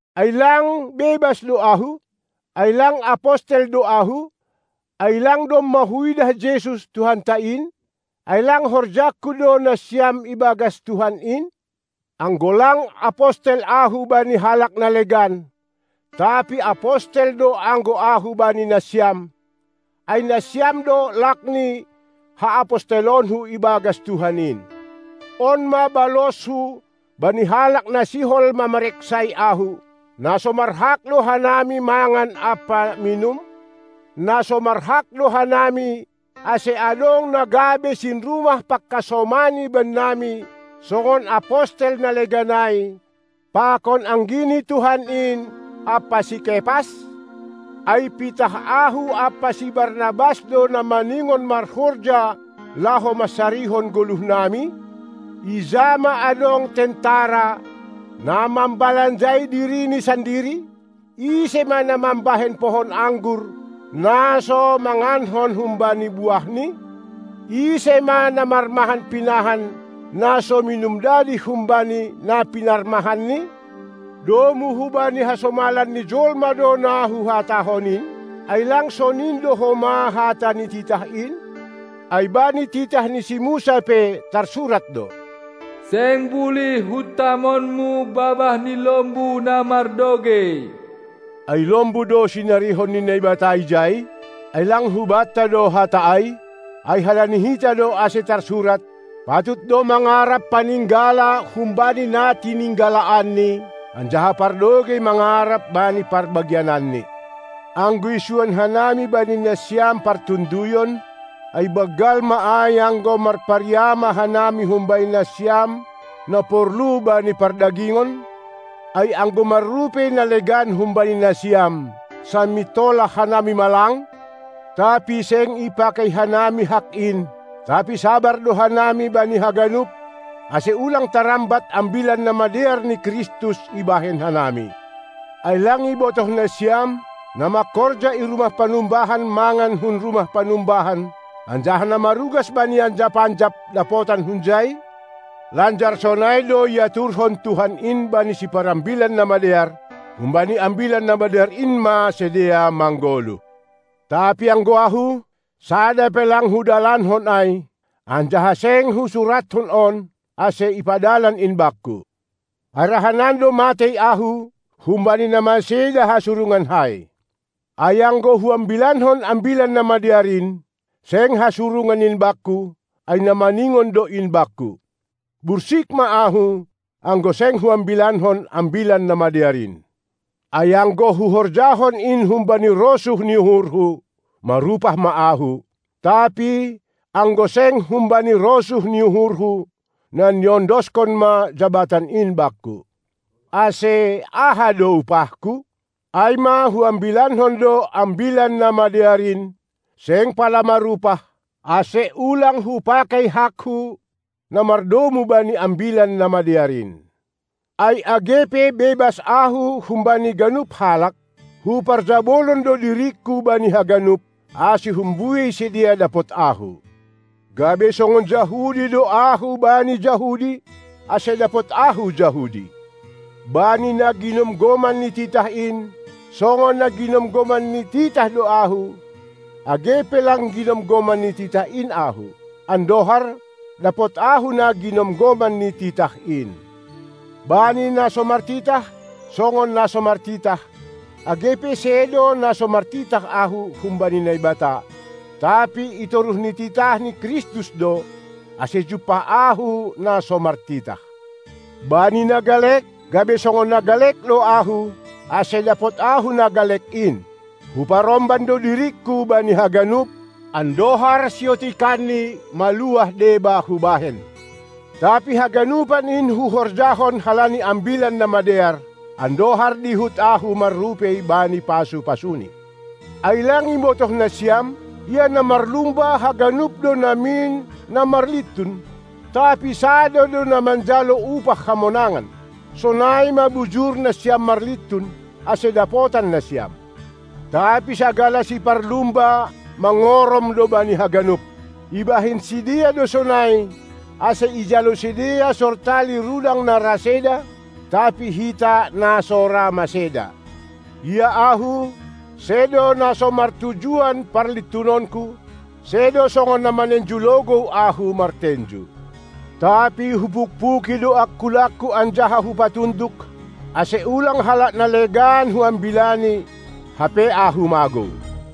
Ai lang bebas do ahu? Ai lang apostel do ahu? Ai lang domma huidah Jesus, Tuhanta in? Ai lang horjangku do nasiam ibagas Tuhan in? Anggo lang apostel ahu bani halak na legan, tapi apostel do anggo ahu bani nasiam, ai nasiam do lak ni haapostelonku ibagas Tuhan in! On ma balosku bani halak na sihol mamareksai ahu. Na so marhak do hanami mangan ampa minum? Na so marhak do hanami ase adong na gabe sinrumah pangkasomani bennami, songon apostel na legan ai, pakon anggi ni Tuhan in ampa si Kepas? Ai pitah ahu ampa si Barnabas do na maningon marhorja laho mansarihon goluhnami? Ija ma adong tentara, na mambalanjai dirini sandiri? Ise ma na mambahen pohon anggur, na so mangankon humbani buahni? Ise ma na marmahan pinahan, na so minum dadih humbani na pinarmahanni? Domu hubani hasomalan ni jolma do na huhatahon in? Ai lang sonin do homa hata ni titah in? Ai bani titah ni si Musa pe tarsurat do: Seng bulih huntamonmu babah ni lombu na mardogei! Ai lombu do sinarihon ni Naibata ijai? Ai lang hubanta do hata ai? Ai halani hita do ase tarsurat: Patut do mangarap paninggala humbani na tininggalaanni, anjaha pardogei mangarap bani parbagiananni. Anggo isuan hanami bani nasiam partonduyon, ai banggal ma ai anggo marpariama hanami humbani nasiam na porlu bani pardagingon? Ai anggo marrupei na legan humbani nasiam, samintolah hanami ma lang? Tapi seng ipakei hanami hak in, tapi sabar do hanami bani haganup, ase ulang tarambat Ambilan Namadear ni Kristus ibahen hanami. Ai lang ibotoh nasiam, na mangkorja i rumah panumbahan mangan hun rumah panumbahan, anjaha na marugas bani anjap-anjap, dapotan hunjai? Lanjar sonai do iaturhon Tuhan in bani siparambilan na madear: Humbani Ambilan Namadear in ma sidea manggoluh. Tapi anggo ahu, sada pe lang hudalankon ai; anjaha seng husurathon on, ase ipadalan in bakku. Ai rahanan do matei ahu, humbani na maseda hasurungankai. Ai anggo huambilankon Ambilan Namadear in, seng hasurungan in bakku, ai na maningon do in bakku. Bursik ma ahu, anggo seng huambilankon Ambilan Namadear in. Ai anggo huhorjahon in humbani rosuh ni uhurhu, marupah ma ahu. Tapi anggo seng humbani rosuh ni uhurhu, na niondoskon ma jabatan in bakku. Ase aha do upahku? Ai ma, huambilankon do Ambilan Namadear in, seng pala marupah, ase ulang hupakei hakku na mardomu bani Ambilan Namadear in. Ai age pe bebas ahu humbani ganup halak, huparjabolon do diringku bani haganup, ase humbuei sidea dapot ahu. Gabe songon Jahudi do ahu bani Jahudi, ase dapot ahu Jahudi. Bani na ginomgoman ni titah in, songon na ginomgoman ni titah do ahu, age pe lang ginomgoman ni titah in ahu, andohar dapot ahu na ginomgoman ni titah in. Bani na so martitah songon na so martitah, age pe sedo na so martitah ahu humbani Naibata, tapi itoruh ni titah ni Kristus do, ase jumpah ahu na so martitah. Bani na galek, gabe songon na galek do ahu, ase dapot ahu na galek in. Huparomban do diringku bani haganup, andohar siotikanni maluah deba hubahen. Tapi haganupan in huhorjahon halani Ambilan Namadear, andohar dihut ahu marrupei bani pasu-pasuni. Ai lang ibotoh nasiam, ia na marlumba haganup do namin na marlintun, tapi sada do na manjalo upah hamonangan. Sonai ma bujur nasiam marlintun, ase dapotan nasiam. Tapi sagala siparlumba mangorom do bani haganup. Ibahen sidea do sonai, ase ijalo sidea sortali rudang na ra seda, tapi hita na so ra maseda. Ia ahu, sedo na so martujuan parlintunonku, sedo songon na manenju logou ahu martenju. Tapi hupukpuki do angkulangku anjaha hupatunduk, ase ulang halak na legan huambilani, hape ahu magou.